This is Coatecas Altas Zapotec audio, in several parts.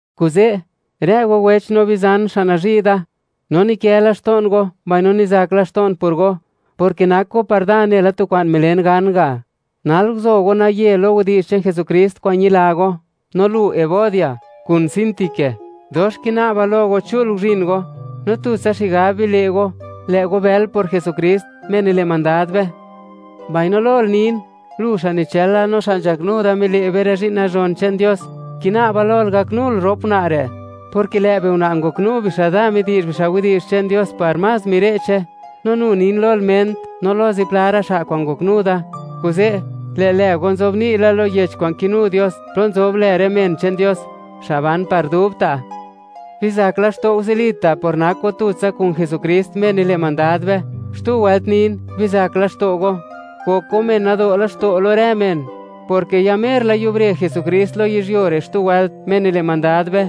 Kuze', rë go wech no bizan xa' nazhi' da, no nikë laxto'n go, mbaino nizak laxto'n por go, porke nak go par da nela tu kwa'n milen gan ga'; nal guzo go naye lo widi'zh che'n Jesukrist kwa'n ñila go. No lu, Evodia, kun Síntique, dox kina'ba lo go chul guzhin go, no tutsa xigab bile' go, lë' go bël por Jesukrist, Me nile' mandad be. Mbaino lol nin, lu xa' nichëla no xa' nzhaknu da mile' be rë zhi'n nazhon che'n Dios; kina'ba lol gaknul rop una' re', porke lë' biuna' ngoknu bixa' da midi'zh bixa' widi'zh che'n Dios par más mire'che; no nu nin lol Ment, no lo zipla ra' xa' kwa'n ngoknu da. Kuze' lë' lë go nzobni' la lo Yech kwa'n kinu Dios, plo nzob lë rë men che'n Dios, xa' ban par dubta'. Bizak laxto' go zilita' por nak go tutsa kun Jesukrist, Me nile' mandad be. Xtu wëlt nin: ¡Bizak laxto' go! Gok go men nado' laxto' lo rë men, porke ya mer la yubre Jesukrist lo yizhyuo re' xtu wëlt, Me nile' mandad be.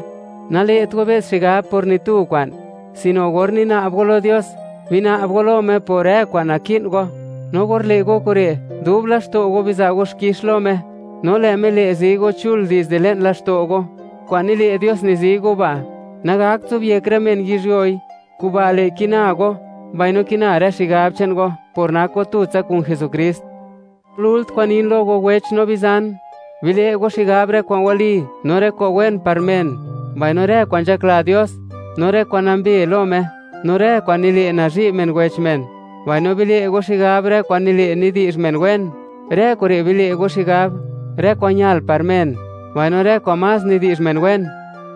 Nale't go be's xigab por ni tu kwa'n, sino or nina'b go lo Dios, bina'b go lo Me por rë kwa'n naki'n go; no or le' go kure', dub laxto' go, biza' go xkix lo Me. No lë' Me le', zi go chul dizde le'n laxto' go. Kwa'n nile' Dios nizi go ba', nagakt zobyek rë men yizhyuoi. Kuba' le' kina go, mbaino kina rë xigab che'n go, por nak go tutsa kun Jesukrist. Lult kwa'n nin lo go wech no bizan; bile' go xigab rë kwa'n wali, no rë kwa'n wen par men, mbaino rë kwa'n nzhakla Dios, no rë kwa'n nambe lo Me, no rë kwa'n nile' nazhi' men wech men; mbaino bile' go xigab rë kwa'n nile' nidi'zh men wen. Rë kure' bile' go xigab, rë kwa'n ñal par men, mbaino rë kwa'n más nidi'zh men wen.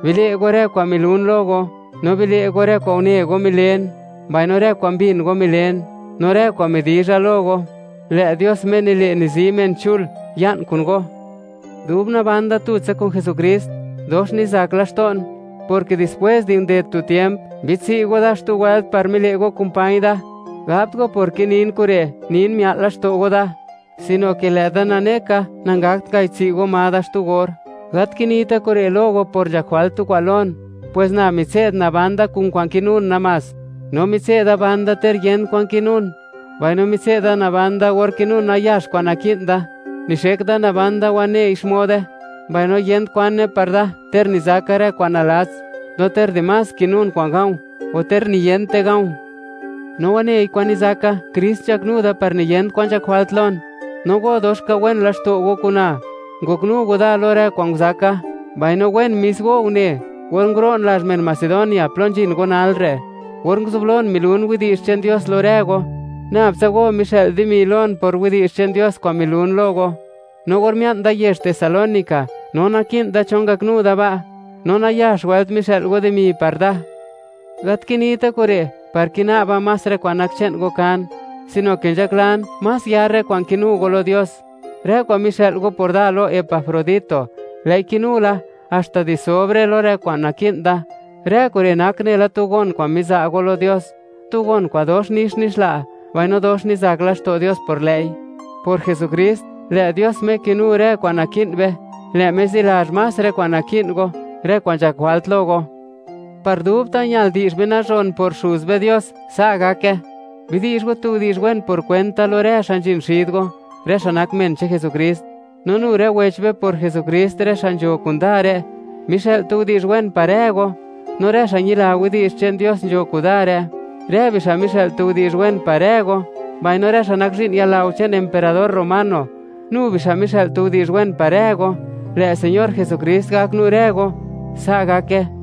Bile' go rë kwa'n milun lo go, no bile' go rë kwa'n une go milen, mbaino rë kwa'n mbin go milen. No rë kwa'n midizha lo go, lë' Dios, Me nile' nizi men chul, ya'n kun go. Dub naban da tutsa kun Jesukrist, dox nizak laxto'n, porke dispwés di nded tu tiemp, mbidtsi' go da xtu wëlt par mile' go kumpañ da. Gabt go porke nin kure', nin mia'l laxto' go da, sino ke lë' da nane ka, nangakt ngayidtsi' go ma da xtu or. Gat kinita' kure' lo go por nzhak jwalt tu kwa'n lon, pwes na mitse'd naban da kun kwa'n kinun namás. No mitse'da naban da ter yent kwan kinun, mbaino mitse'da da naban da or kinun nayax kwa'n naki'n da. Nixek da naban da waney xmode, mbaino yent kwane par da, ter nizaka rë kwa'n nalats. No ter dimás kinun kwa'n ga̱o̱, o ter niyent kwa'n ga̱o̱. No wanei kwa'n nizaka, Krist nzhaknu da par niyent kwan nzhak jwalt lon. No go, dox ka wen laxto' go kuna, ngoknu go da lo rë kwa'n nguzaka. Mbaino wen mis go une, or nguro'n lazh men Macedonia plo nzhin go nal re', or nguzublon milun widi'zh che'n Dios lo rë go, nab tsa go mixë'l dimi lon por widi'zh che'n Dios kwa'n milun lo go. No or mia'n da yezh Tesalónica, no naki'n da cho ngaknu da ba', no nayax wëlt mixë'l go dimi par da. Gat kinita' kure' par kina'ba más rë kwa'n nak che'n go kan, sino ke nzhaklan, más yar rë kwa'n kinu go lo Dios. Rë kwa'n mixë'l go par da lo Epafrodito, lë'i kinu la, haxta di sobre lo rë kwa'n naki'n da. Rë kure' nak nela tu gon kwa'n miza' go lo Dios, tu gon kwa'n dox nix nixla, mbaino dox nizak laxto' Dios por lë'i. Por Jesukrist, lë' Dios, Me kinu rë kwa'n naki'n be, lë' Me zilazh más rë kwa'n naki'n go, rë kwa'n nzhak jwalt lo go. ¡Par dubta', ñal di'zh be nazhon por Xuz be Dios! Sa' gake. Bidi'zh go tu widi'zh wen por kwent da, lo rë xa' nzhin xid go, rë xa' nak men che'n Jesukrist. No nu rë wech be por Jesukrist, rë xa' nzho kuda re', mixë'l tu widi'zh wen par rë go. No rë xa' ñila widi'zh che'n Dios nzho kuda re', rë bixa' mixë'l tu widi'zh wen par rë go; mbaino rë xa' nak zhi'n yalao che'n emperador romano, nu bixa' mixë'l tu widi'zh wen par rë go. Lë' Señor Jesukrist gaknu rë go. Sa' gake.